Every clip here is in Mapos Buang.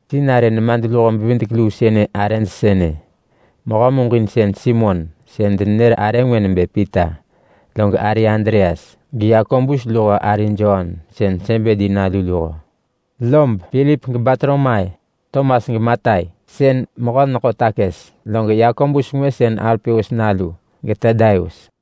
Sinarë nemadluho-bevidek-luu sënë arëj sënë: Mehö muġinsën Simon (sën denenër arë ngwë nebë Pita) log ari Andreas, geYakobus luho ari Jon sën Sebedi nalu luho, lob Pilip geBartolomai, Tomas geMatai, sën yi mehö-neḳo-takës. Log Yakobus ngwë sën Alpeus nalu, geTadaius.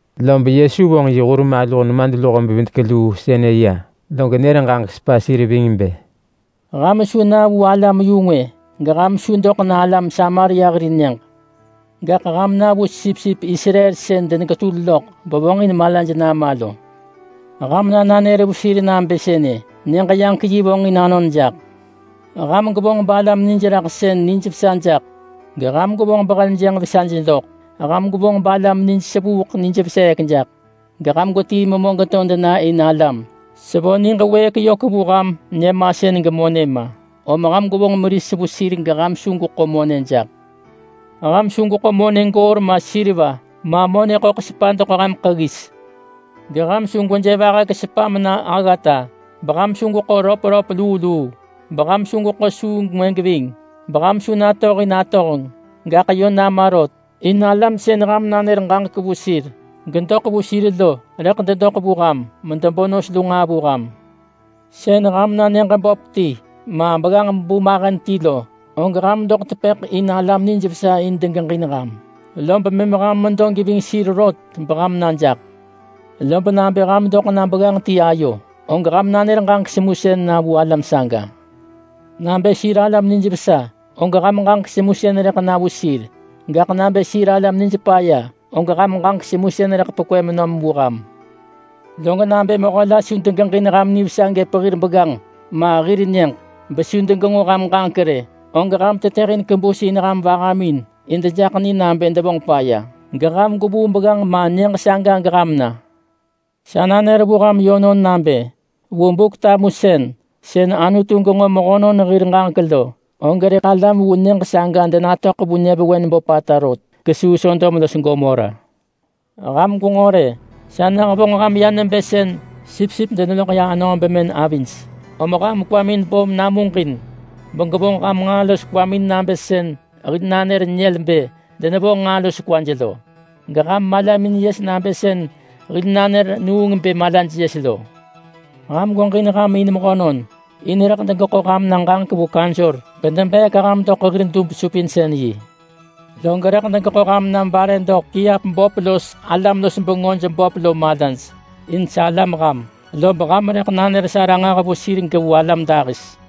Lob Yesu vonġ yi hur maluh nemadluho-bevidek-luu sënë ya, log nër ġaġek vu sir ving bë, “Ham su na vu alam-yu-ngwë. Geham su doḳ na alam Samaria hir nyëġ. Gaḳ ham na vu sipsip Israel sën deneketul loḳ bevonġin malaj nama lo. Ham na nanër vu sir nabë sënë: ‘Nyëġ-yaġek-yi vonġin anon jaḳ!’ Ham gwevonġ balam nijraḳsën nijvesa jaḳ, geham gwevonġ beheljënġ vesaj doḳ. Ham gwevonġ balam nij sevuuḳ nij veseek jaḳ, geham gwetii memö geto dena in alam. Sevo niġ wëëk yök vu ham nyëmasën gemonë ma, om ham gwevonġ meris vu sir geham su gweḳo monë jaḳ. Ham su gweḳo monë goor ma seriva, ma monë ḳöḳ sepa doḳ ham ḳeggis. Geham su gweje vahek sepa mena aggata, beham su gweḳo röpröp luu luu, beham su gweḳo suu ngwë geving, beham su natohin atohenġ. Gaḳ yö nama rot! In alam sën ham nanër ġaġek vu sir gedoḳ vu sir lo rëḳ dedoḳ vu ham medebo nos lu nġaa vu ham. Sën ham na nyëġ böp ti ma begganġ-bu mahen ti lo, og ham doḳ tepëḳ in alam nijvesa in degeġin ham, lob mëm ham medo geving sir rot beham na jaḳ. Lob nabë ham doḳ na begganġ ti ayo, og ham nanër ġaġek semusën vu alam saga. Nabë sir alam nijvesa, og ham ġaġek semusën rëḳ na vu sir. Gaḳ nabë sir alam nij paya, og ham ġaġek semusën rëḳ pekwë menom vu ham. Log nabë mehö la su degeġin ham nivesa gëp hir begganġ ma hir nyëġ rë, besu degenġo ham ġaġek rë, og ham tetëhin kebus in ham vahamin in dejaḳ ni nabë devonġ paya, gegwevuu begganġ ma nyëġ saga geham na. Sa nanër vu ham yönon nabë, vu Buk-tamusën, sën Anutu genġo mehönon hir ġaġek lo, og rëḳ alam vu nyëġ saga denatöḳ vu nyëvewen böpata rot kesuu Sodom los Gomora.” “Ham gwenġo rë, sa nehevonġ ham ya nebë sën sipsip deneloḳ ya anöö bemën avij. Om ham kwamin bo namuġin begwevonġ ham nġaa los kwamin nabë sën hil nanër nyël bë denevonġ nġaa los kwaj lo. Geham malamin yes nabë sën hil nanër nuung bë malaj yes lo. Ham gweġin ham in mehönon. In rëḳ degeḳo ham na ġaġek vu kaunsor bedebeek ham doḳ hir dub-supinsën-yi. Log rëḳ degeḳo ham na bare doḳ kiap böp los alam-los-bengöj böp lo malaj, in salam ham, lob ham rëḳ nanër sa ranġah vu sir gevu alam dahis.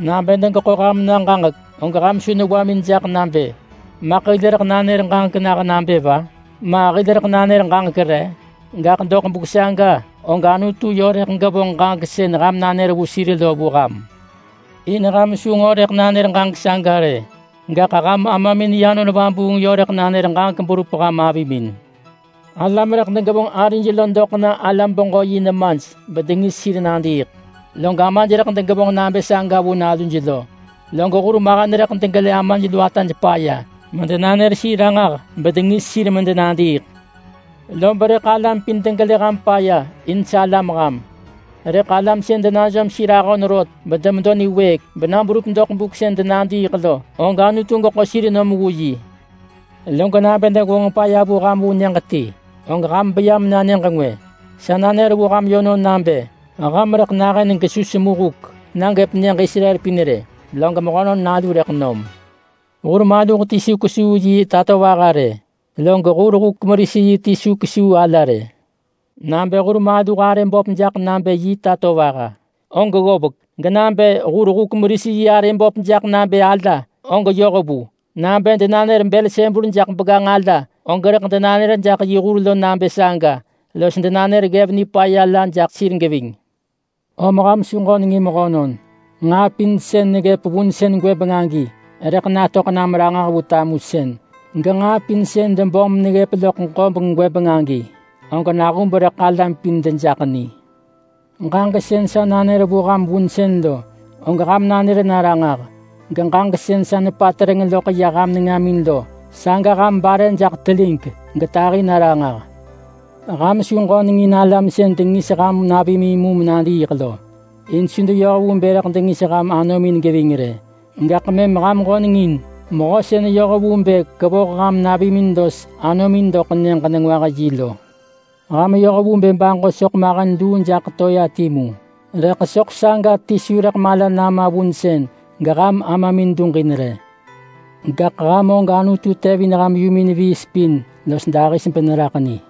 Nabë degeḳo ham na ġaġek, og ham su newamin jaḳ nabë, ‘Maḳ hil rëḳ nanër ġaġek nah nabë va? Ma hil rëḳ nanër ġaġek re?’ Gaḳ doḳ buk saga og Anutu yö rëḳ gevonġ ġaġek sën ham nanër vu sir lo vu ham. In ham su nġo rëḳ nanër ġaġek saga rë, gaḳ ham Amamin yi Anon Vabuung yö rëḳ nanër ġaġek berup ham avimin. Alam rëḳ degevonġ arij lo doḳ na alam-beġö-yi nemaj bedengis sir medenadiiḳ. Log amaj rëḳ degevonġ nabë saga vu naluj. Log hurmahen rëḳ degelë amaj lu ataj paya medenanër sir ranġah bedengis sir medenadiiḳ. Lob rëḳ alam pin degelë ham paya in salam ham. Gaḳ alam sën denajom sir ahon rot, bena berup doḳ buk sën denadiiḳ lo, saga rëḳ Anutu geḳo sir nom vu yi. Lob nabë degevonġ paya vu ham vu nyëġ la, og ham beya mena nyëġ ngwë. Sa nanër vu ham yönon nabë ham nahën gesu rëḳ semu huk na gëp nyëġ Israel pin rë, log Mehönon Nalu rëḳ nom. Hur maluh ti su kesuu yi tatovaha rë, log hur-huk-meris-yi ti su kesuu ala rë. Nabë hur maluh arëj böp jaḳ nabë hir tatovaha, og ggovek. Genabë hur-huk-meris-yi arëj böp jaḳ nabë alaj, og yoh vu. Nabë denanër Belsebul jaḳ begganġ ala, og rëḳ denanër yi hur nabë saga los denanër ggev nipaya la jaḳ sir geving.” “Om ham su ġönengin mehönon. Nġaa pin sën neggëp vunsën gwëbeng rëḳ natöḳ nam ranġah vu tamusën. Genġaa pin sën debom meneggëp loḳ ġobeng gwëbeng agi, og nahub rëḳ alam pin dejaḳ ni. Ġaġek sën sa nanër vu ham vunsën lo, og ham nanër na ranġah. Geġaġek sën sa nepatereng loḳ ya ham nengamin lo, saga ham bare jaḳ telig getahi na ranġah. Ham su ġönengin alam sën dengis ham navimin mu menadiiḳ lo, in su deyoh vu bë rëḳ dengis ham anomin geving rë. Gaḳ mëm ham ġöneng in Mehö sën yoh vu bë kevoh ham navimin los anomin doḳ Nyëġ-nengwah-yi lo. Ham yoh vu bë baġo soḳ mahen luu jaḳ toea timu, rëḳ soḳ saga ti su rëḳ mala nama vunsën geham Amamin duġin rë. Gaḳ ham og Anutu tevin ham yumin viis pin los dahis beneraḳ ni.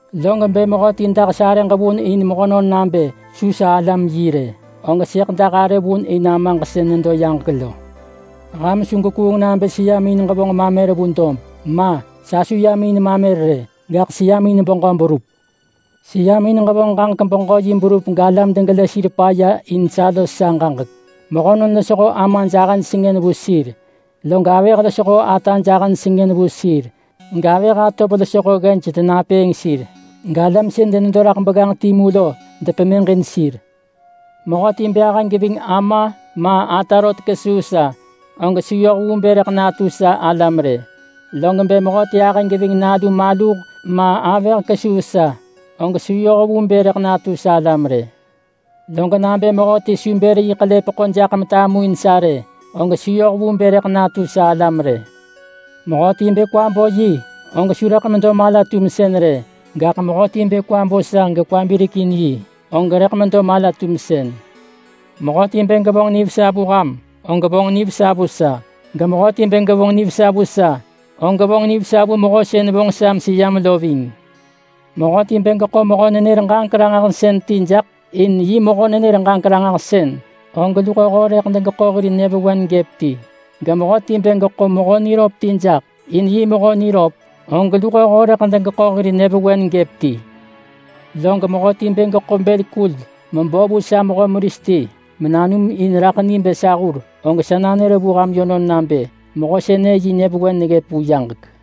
Log bë mehöti dah sarëġ vun in mehönon nabë su sa alam yi rë, og sëḳ dah arë vun in Amaġ sën nedo yaġek lo.” “Ham su gwekuung nabë seyam in ġevonġ mamer vu dob. Ma! Sa su yam in mamer rë, gaḳ seyam in beġö berup. Seyam in ġevonġ ġaġek-beġö-yi berup galam degelë sir paya in sa los sa ġaġek. Mehönon losho amaj ahëj sengën vu sir. Log avëh losho ataj ahëj sengën vu sir, gavëh atov losho ggej denapëëng sir, galam sën denedo raḳ begganġ timu lo depemëġin sir. Mehöti bë ahë geving ama ma ata rot kesuu sa, og su yoh vu bë rëḳ natu sa alam rë. Log bë mehöti ahë geving nalu maluh ma avëh kesuu sa, og su yoh vu bë rëḳ natu sa alam rë. Log mehöti bë su bër yi ḳelepeḳo jaḳ metamuin sa rë, og su yoh vu bë rëḳ natu sa alam rë. Mehöti bë kwa bo yi, og su rëḳ medo mala-tumsën rë. Gaḳ mehöti bë kwa bo sa gekwa birek in yi, og rëḳ medo mala-tumsën.” “Mehöti bë gevonġ nivesa vu ham, og vonġ nivesa vu sa. Gemehöti bë gevonġ nivesa vu sa, og vonġ nivesa vu Mehö sën vonġ sa meseyam lo ving. Mehöti bë geḳo mehö-nenër-ġaġek-ranġahsën ti jaḳ in yi mehö-nenër-ġaġek-ranġahsën, og luhoho rëḳ degeḳo hir nyëvewen gëp ti. Gemehöti bë geḳo mehö niröp ti jaḳ in yi mehö niröp, og luhoho rëḳ degeḳo hir nyëvewen gëp ti. Log mehöti bë geḳo bël kul mebo vu sa mehö meris ti menanum in raḳ ni bë sa hur, og sa nanër vu ham yönon nabë, mehö sënë yi nyë vewen neggëp vu yaġek.”